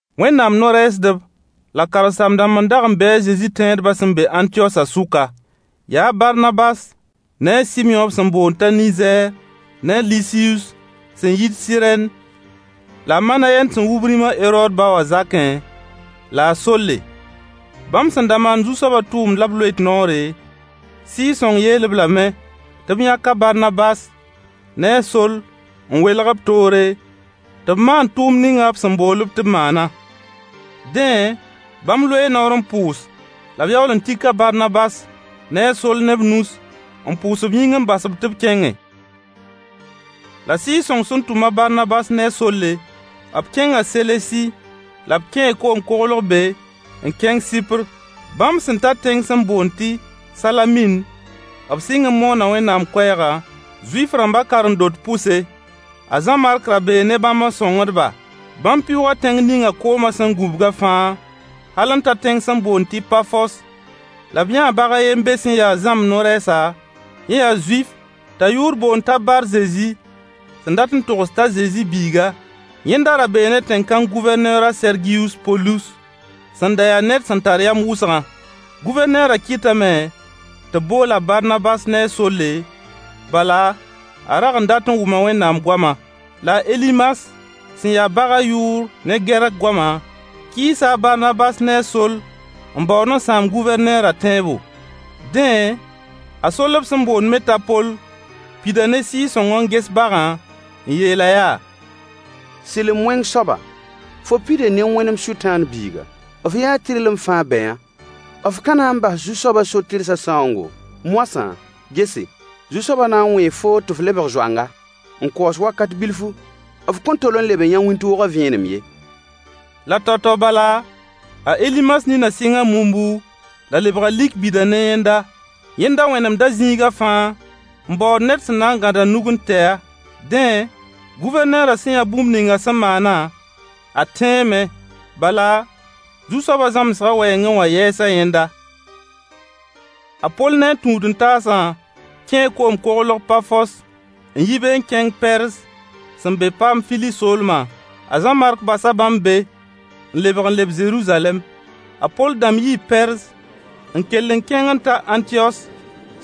Wẽnnaam no-rɛɛsdb la karen-saam-dãmb n dag n be a Zezi tẽedba sẽn be Ãntiyosã sʋka. Yaa a Barnabas ne a Sɩmyõ b sẽn boond t'a Nizɛɛr ne a lisiyus sẽn yit Sɩrɛn la a Manayɛn sẽn wub rĩma Herood ba wã Zakẽ la a Solle. Bãmb sẽn da maand Zu-soaba tʋʋmd la b loet noore, Sɩɩg-sõng yeel-b lame tɩ b yãk a Barnabas ne a Soll n welg-b toore, tɩ b maan tʋʋmd ninga b sẽn bool-b tɩ b maana. Dẽ, bãmb loee noor n pʋʋs la yaool n tik a Barnabas ne Soll ne b nus pʋʋs b yĩng n bas-b tɩ b kẽnge. La Sɩɩg-sõng sẽn tʋm a Barnabas ne Solle, b kẽnga Selesi, la b kẽe koom-koglg be n kẽng Sɩpr. Bãmb sẽn ta tẽng sẽn boond tɩ Salamin, b sɩng n moona Wẽnnaam koɛɛga Zuif-rãmba karen-dot pʋse. A Zã-Mark ra bee ne bãmb n sõngd-ba. Bãmb pɩʋʋga tẽng ninga koomã sẽn gũbgã fãa hal n ta tẽng sẽn boond tɩ Pafos, la b yãa bag a yen be sẽn ya zãmb-no-rɛɛsa, yẽ yaa Zuif t'a yʋʋr boond t'a Bar-Zezi sẽn dat n togs t'a zezi biiga. Yẽnda ra bee ne tẽn-kãng Gʋvɛrneer a Sergiyus Polus sẽn da ya ned sẽn tar yam wʋsgã. Gʋvɛrneerã kɩtame tɩ b bool a Barnabas ne a Solle, bala a rag n dat wʋma Wẽnnaam goama. La a Elimas sẽn ya bagã yʋʋr ne Gɛrk goama kɩɩsa a Barnabas ne a Soll n baood n sãam Gʋvɛrneerã tẽebo. Dẽ, a Soll b sẽn boond me t'a Poll pida ne Sɩɩg-sõng n ges bagã, n yeel-a yaa: Sɩlem-wẽng soaba fo pida ne wẽnem Sʋtãan biiga, f yaa tɩrlem fãa bɛyã. F ka na n bas Zu-soab so-tɩrsã sãoongo? Moasã, gese, Zu-soaba na n wẽe foo ta f leg Zoang, n kaooswakat bilfu f kõn tol n leb n yã wĩntoogã vẽenem ye. La tao-tao bala, a Elimas nina sɩnga mumbu la lebga lik bida ne yẽnda. Yẽnda Wẽnnaam zĩiga fãa n baood ned sẽn na n gãd a nug n tɛ-a. Dẽ, Guvɛrneerã sẽn yã bũmb ninga sẽn maana, a tẽeme. Bala, Zu-soaba zãmsgã wɛɛngẽ wã yɛɛsa yẽnda. A Poll ne a tũud-n-taasa kẽe koom-koglg Pafos n yi be n kẽng Pɛrz sẽn be Paamfili soolma. A Zã-Mark basa bãmb be n lebg n leb Zeruzalɛm. A Poll dãmb yii Pɛrz n kell n kẽng n ta Ãntiyos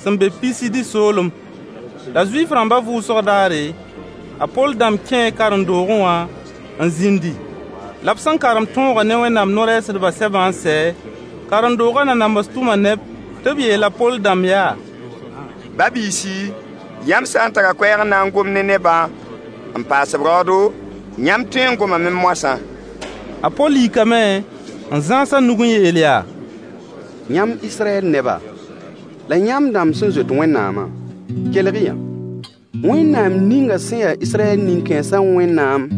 sẽn be Pisidi soolem. La Zuif-rãmba vʋʋsg daare, a Poll dãmb kẽ karen-doogẽ wã n zĩndi. La sẽn karem tõogã ne Wẽnnaam no-rɛɛsdbã sɛbã n sɛ, karen-doogã nanams tʋma neb tɩ b yeel a Poll dãmb yaa: Ba-biisi, yãmb sã n tara koɛɛg n na n gom ne nebã n paas-b raoodo, yãmb tõee n gomame moasã. A Poll yikame n zãas a nug n yeel yaa: Yãmb Israyɛl neba, la yãmb dãmb sẽn zoet Wẽnnaamã, kelg-y yã! Wẽnnaam ninga sẽn ya Israyɛl nin-kãensa Wẽnnaam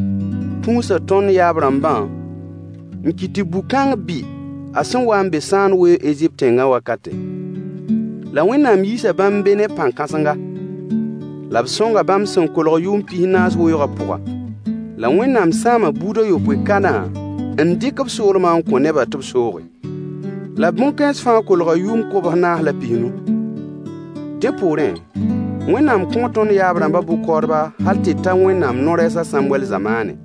tũusa tõnd yaab-rãmbã n kɩt tɩ bu-kãng bɩ a sẽn wa n be sãand weoog Ezipt tẽngã wakate. La Wẽnnaam yiisa bãmb be ne pãn-kãsenga. La b sõnga bãmb sẽn kolg yʋʋm pis-naas weooga pʋga. La Wẽnnaam sãama buud a yopoe Kana n dɩk b soolma n kõ b nebã tɩ b sooge. La bõn-kãens fãa kolga yʋʋm kobs-naas la pis-nu. Dẽ poorẽ, Wẽnnaam kõo tõnd yaab-rãmba bʋ-kaoodba hal tɩ ta Wẽnnaam no-rɛɛs a Sãmwɛll zamaane.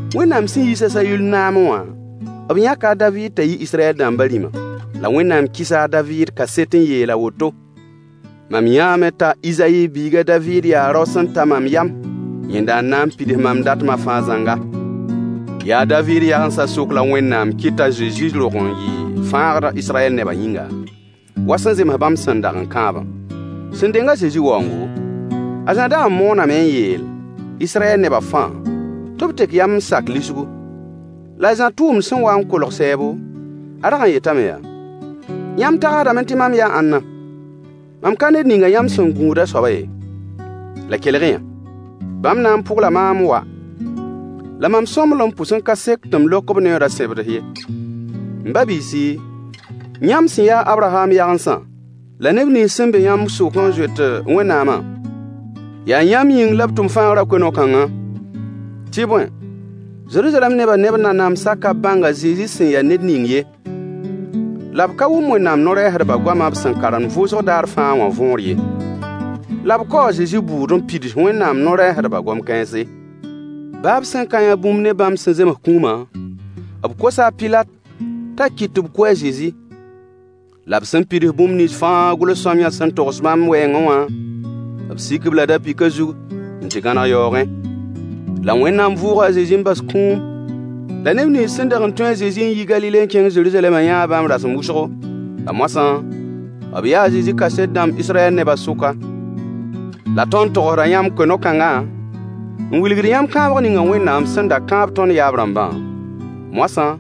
Wẽnnaam sẽn yiis a Sayull naame wã b yãka a David t'a yɩ Israyɛl dãmba rĩma. La Wẽnnaam kɩsa a David kaset n yeel a woto: “Mam yãame t'a Izayi biig a Daviid yaa rao sẽn ta mam yam. Yẽnda n na n pids mam datmã fãa zãnga.” Yaa a Daviid yagensã sʋk la Wẽnnaam kɩtɩ t'a Zezi rog n yɩɩ fãagd Israyɛl neba yĩnga wa sẽn zems bãmb sẽn dag n kãabã. Sẽn deng a Zezi waoongo, a Zã dag n mooname n yeel Israyɛl neba fãa tɩ b tek yam n sak lisgu. La a Zã tʋʋmd sẽn wa n kolgd sɛɛbo, a rag n yetame yaa: Yãmb tagsdame tɩ mam yaa ãnna? Mam ka ned ninga yãmb sẽn gũud a soaba ye. La kelg-y yã: Bãmb na n pʋgla maam n waa, la mam sõmblem pʋs n ka sek tɩ m lok b neooda sẽbds ye. M ba-biisi, yãmb sẽn ya a Abraham yagensã la neb nins sẽn be yãmb sʋk n zoet Wẽnnaamã, yaa yãmb yĩng la b tʋm fãagrã koe-no-kãngã. Tɩ bõe, Zeruzalɛm neba ne b nanamsa ka bãng a Zezi sẽn ya ned ning ye. La b ka wʋm Wẽnnaam no-rɛɛsdba goama b sẽn karemd vʋʋsg daar fãa wã võor ye. La b kaoo a Zezi bʋʋd n pids Wẽnnaam no-rɛɛsdba gom-kãense. Baa b sẽn ka yã bũmb ne bãmb sẽn zems kũuma, b kosa a Pilat t'a kɩt tɩ b kʋ a Zezi. La b sẽn pids bũmb nins fãa gʋls-sõamyã sẽn da togs bãmb wɛɛngẽ wã, b sik-b-la da-pɩkã zug n tɩ gãneg yaoogẽ. La Wẽnnaam vʋʋga a Zezi n bas kũum. La neb nins sẽn dag n tũ a Zezi n yi Galile n kẽng Zeruzalɛm yãa bãmb rasem wʋsgo. La moasã b yaa a Zezi kaset dãmb Israyɛl nebã sʋka. La tõnd togsda yãmb koe-no-kãnga, n wɩlgd yãmb kãabg ninga Wẽnnaam sẽn da kãab tõnd yaab-rãmbã, moasã,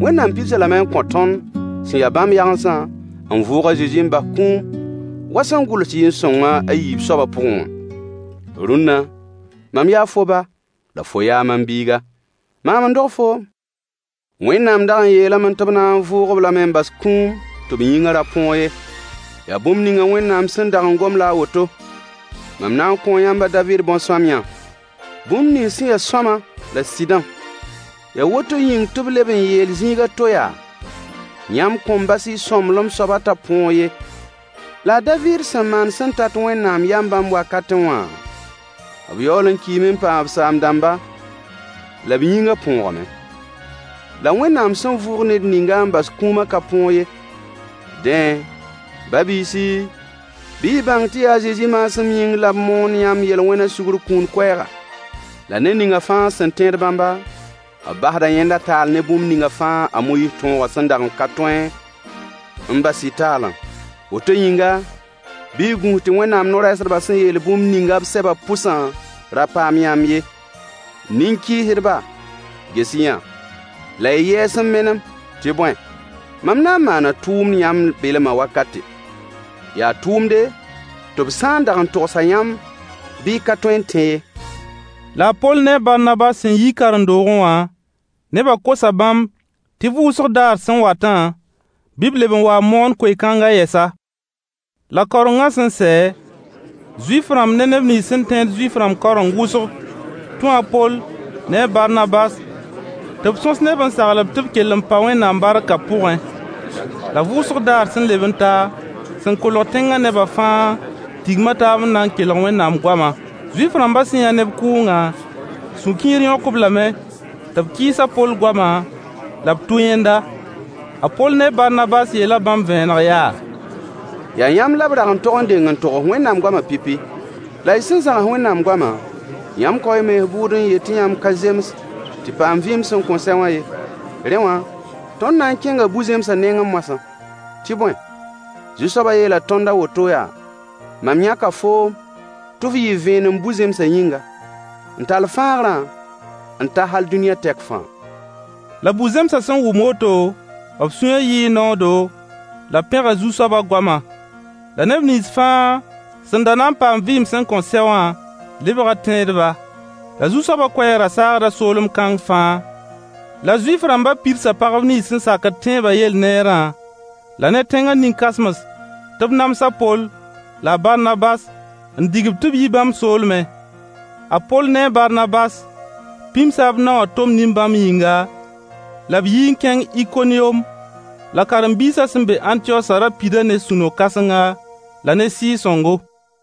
Wẽnnaam pids-a lame n kõ tõnd sẽn ya bãmb yagensã n vʋʋg a Zezi n bas kũum wa sẽn gʋls yɩɩn-sõng a yiib soaba pʋgẽ wã: “Rũnna, mam yaa fo ba, la fo yaa mam biiga, maam n dog foom.” Wẽnnaam dag n yeelame tɩ b na n vʋʋg-b lame n bas kũuma tɩ b yĩngã ra põog ye. Yaa bũmb ninga Wẽnnaam sẽn dag n gom la a woto: “Mam na n kõo yãmb a David bõn-sõamyã. Bũmb nins sẽn sõama la sɩdã.” Yaa woto yĩng tɩ b leb n yeel zĩig a to yaa: “Yãmb kõn bas y sõmblem soaba t'a põog ye.” La a Daviid sẽn maan sẽn tat Wẽnnaam yam bãmb wakatẽ wã, b yaool n kiime n paam b saam-dãmba, la b yĩnga põogame. La Wẽnnaam sẽn vʋʋg ned ninga n bas kũuma ka põog ye. Dẽ, ba-biisi, bɩ y bãng tɩ yaa a Zezi maasem yĩng la b moond yãmb yel-wẽma sugr kũun koɛɛga. La ned ninga fãõa sẽn tẽed bãmba, b basda yẽnda taal ne bũmb ninga fãa a Moyiis tõogã sẽn dag n ka tõe n bas-y taalã. Woto yĩnga, bɩ y gũus tɩ Wẽnnaam no-rɛɛsdba sẽn yeel bũmb ninga b sɛbã pʋsã ra paam yãmb ye. “Nin-kɩɩsdba, ges-y-yã la y yɛɛs n menem, tɩ bõe mam na n maana tʋʋmd yãmb belma wakate. Yaa tʋʋmde, tɩ b sã n dag n togs-a yãmb bɩ y ka tõe n tẽ ye.” La a Poll ne a Barnabas sẽn yi karen-doogẽ wã, neba kosa bãmb tɩ vʋʋsg daar sẽn watã bɩ b leb n wa n moon koe-kãnga yɛsa. La kaorengã sẽn sɛ, Zuif-rãmb ne neb nins sẽn tẽed Zuif-rãmba kaoreng wʋsg tũu a Poll ne a Barnabas tɩ b sõs ne-b n sagl-b tɩ kell n pa Wẽnnaam barkã pʋgẽ. La vʋʋsg daar sẽn leb n ta, sẽn kolg tẽnga neba fãa tigma taab n na n kelg Wẽnnaam goama. Zuif-rãmba sẽn yã neb kʋʋgã, sũ-kiir yõk-b lame tɩ b kɩɩs a Poll goama la b tʋ yẽnda. A Poll ne a Barnabas yeela bãmb vẽeneg yaa: Yaa yãmb la b rag n tog n deng n togs Wẽnnaam goama pipi. La y sẽn zãgs Wẽnnaam goma, yãmb kao y mens bʋʋd n yet tɩ yãmb ka zems tɩ paam vɩɩm sẽn kõn sɛ wã ye. Rẽ wã tõnd na n kẽnga bu-zẽmsã nengẽ moasã. Tɩ bõe, Zu-soaba yeela tõnd a woto yaa: “Mam yãka foom tɩ f yɩ vẽenem bu-zẽmsã yĩnga, n tall fãagrã n ta hal dũniyã tɛk fãa.” La bu-zẽmsa sẽn wʋm woto, b sũyã yɩɩ noodo, la b pẽga Zu-soaba goamã. La neb nins fãa sẽn da na n paam vɩɩm sẽn kõn sɛ wã lebga tẽedba. La Zu-soabas koɛɛg ra saagda soolem kãng fãa. La Zuif-rãmba pagb nins sẽn sakd tẽebã yell neerã la ne tẽnga nin-kãsems tɩ b nams a Poll la a Barnabas n dig-b tɩ b yi bãmb soolmẽ. A Poll ne a Barnabas pĩmsa b nao wã tom nin-bãmb yĩnga, la b yɩ n kẽng Ikoniyom. La karen-biisã sẽn be Ãntiyosã ra pida ne sũ-no-kãsenga la ne Sɩɩg-sõngo.